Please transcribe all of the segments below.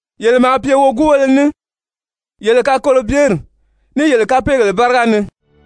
Yele maa pye woguubéle ní, yele kakolobyeri, ní yele kapeegèle báriga ni,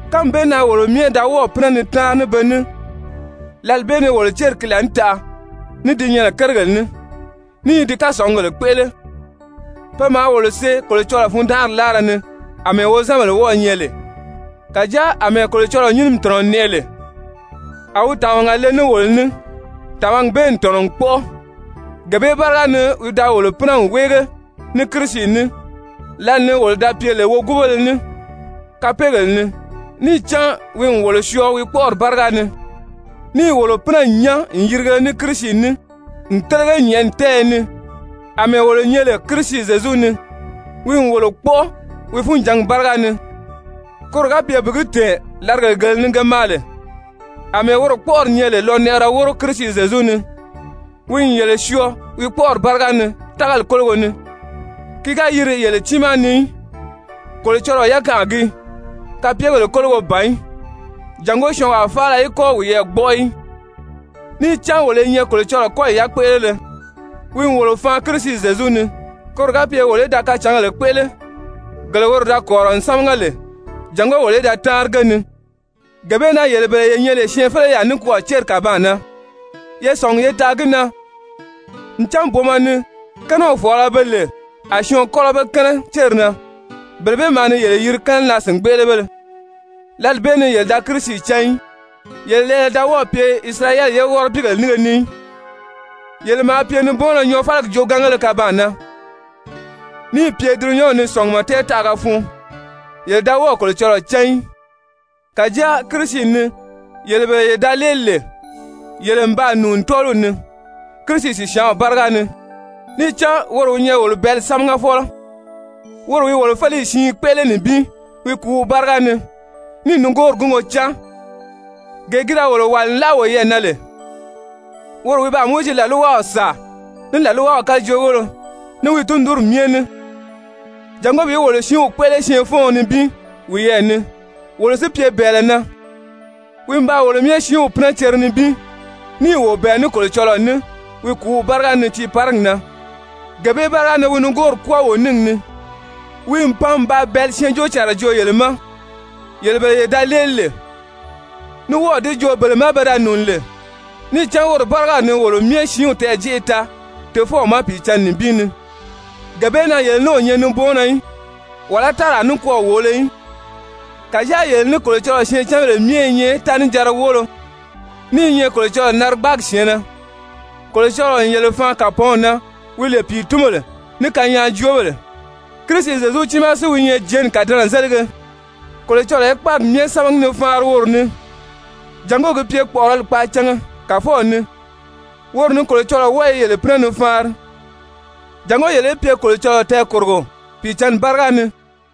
Kánmi bee na wolo myɛ da wɔ́ɔ̀ pínɛ ni táanri ní be ní lǎli bee ni wolo céri ki laànitaʔa, ní di nyɛnɛ kérigèle ni, ní i di kasɔngugèle kpéʔele, pe maa wolo see Kolocɔlɔɔ fundanʔari láara ni àmɛɛ wozanbèle wɔ́ɔ̄ nyɛ lè. Kàjáa àmɛɛ Kolocɔlɔɔ nyínimi tɔ̀nɔ n nɛʔɛ lè, a wi tàmaga le ní wolo ní, tàmagi bee n tɔ̀nɔ n kpɔ́ʔɔ. Gee bee báriga ni wi da wolo pínɛ n wéege ní Kirisi ní, lǎli ni wolo da pye lè woguubéle ní kapeegèle ni, níì cán wi n wolo syɔɔ wi kpɔ́ʔɔri báriga ni, níì wolo pínɛ n nyán n yìrige ní Kirisi ní n télege nyɛ̀ʔɛni tɛ́ɛyɛ ni àmɛɛ wolo nyɛ lè Kirisi Zyezu ni, wi n wolo kpɔ́ʔɔ wi funjǎngi báriga ni, koro ga pye bi gi tɛ̀ɛn làrigèle gele ni ge maa lè, àmɛɛ woro kpɔ́ʔɔri nyɛ lè lɔnɛʔɛrɛ wóro Kirisi Zyezu ni. Wi n yele syɔɔ wi kpɔ́ʔɔri báriga ni tágali kólogo ni. Ki ga yiri yele tiimaa ni í, Kolocɔlɔɔ yakanʔa gii, kapyegèle kólogo ban í jàngó syɔɔnwaa faala í kɔ́ wiyɛɛ gbɔ́ʔɔ í. Níì cán wolo i nyɛ Kolocɔlɔɔ kɔ́yi yakpéʔelere, wi n wolo faan Kirisi Zyezu ni, koro ga pye wolo í da kacǎngèle kpéʔele, gele woro da kɔ̀rirɔ n sámaga lè jàngó wolo í da táanri ge ni. Gee bee na yele bele ye nyɛ lè syɛɛnfeleyaa nikwɔɔ céri kàbaan na, ye sɔ̀ngi ye taa gi na ncan booma ni kɛ́nɛw fɔ̀ɔlɔ, be lè a syɔɔn kɔ́lɔ be kɛ́nɛ céri na, bele bee maa ni yele yiri kɛ́nɛnaa-sìngbeʔelebéle. Lǎli bee ni yele da Kirisi cán í, yele lɛɛlɛ da wɔ́ɔ̀ pye Isirayɛli ye wɔ́rɔbiigèle nínge ni í, yele maa pye nibɔɔnnɔ nyɔɔfaligi joogaangéle kabaan na, níì pye dulunyanw ni sɔ̀ngumɔ tɛɛtaʔaga fun, yele da wɔ́ɔ̀ Kolocɔlɔɔ cán í. Kàjáa Kirisi ni, yele bele ye da léeli lè, yele n baa nùuni tɔ́ɔliw ni Kirisi sìsyaanw báriga ni. Níì cán woro wi nyɛ wolo bɛ̀ɛ́li sámagafɔlɔ, woro wi wolo féleyi siin kpéʔele nibin wi kùúw báriga ni, níì nigoori gúngo cáan, gee ki da wolo wàli n láʔa woyɛɛ na lè. Woro wi baa Mowizi làlwaw sàa ní làlwaw kajoogéle, ní wi tundunri myɛ ní jàngó bi wolo siinw kpéʔele syɛɛnfɔ́ɔn nibin wiyɛɛ ni, wolo si pye bɛ̀ɛlɛ na. Wi n baa wolo myɛ siinw pínɛ cere nibin, níì wo bɛ̀ɛ ní Kolocɔlɔɔ ní wi kùúw báriga ni tiiparigi na, gee bee báriga ni wi nigoori kwɔ́ɔ wo níngi ni. Wi n pan n baa bɛ̀ɛ́li syɛɛnjóocànra joo yele ma, yele bele ye da léeli lè, ní wɔ́ɔ̀ di joo bele ma pe da nùuni lè. Níì cán woro bárigaw ni wolo myɛ siinw tɛɛ̀jeʔe taa Tofɔw ma Pìicǎnni nibin ni. Gee bee na yele ní o nyɛ nibɔɔnnɔ í, wàlá táraa nikwɔɔ wòolo í. Kàjáa yele ní Kolocɔlɔɔ syɛɛncanbèle myɛ i nyɛ tánijanra woolo, ní i nyɛ Kolocɔlɔɔ narigbaagi syɛ̀ɛnnɛ. Kolocɔlɔɔ n yele faan kàpɔɔnw na wi lè pìitunbèle ní kanyaajoobèle. Kirisi Zyezu tiimaa si wi nyɛ jɛ̀ɛ́nni kàdɛnɛzelige. Kolocɔlɔɔ i kpáagi myɛ sámagi ni faanri woro ni jàngó gi pye kpɔ̀ʔɔrɔli kpaacanga Kàfɔw ni. Woro ni Kolocɔlɔɔ wɔ́ɔ i yele pínɛ ni faanri jàngó yele í pye Kolocɔlɔɔ tɛɛkòrogo Pìicǎnni báriga ni.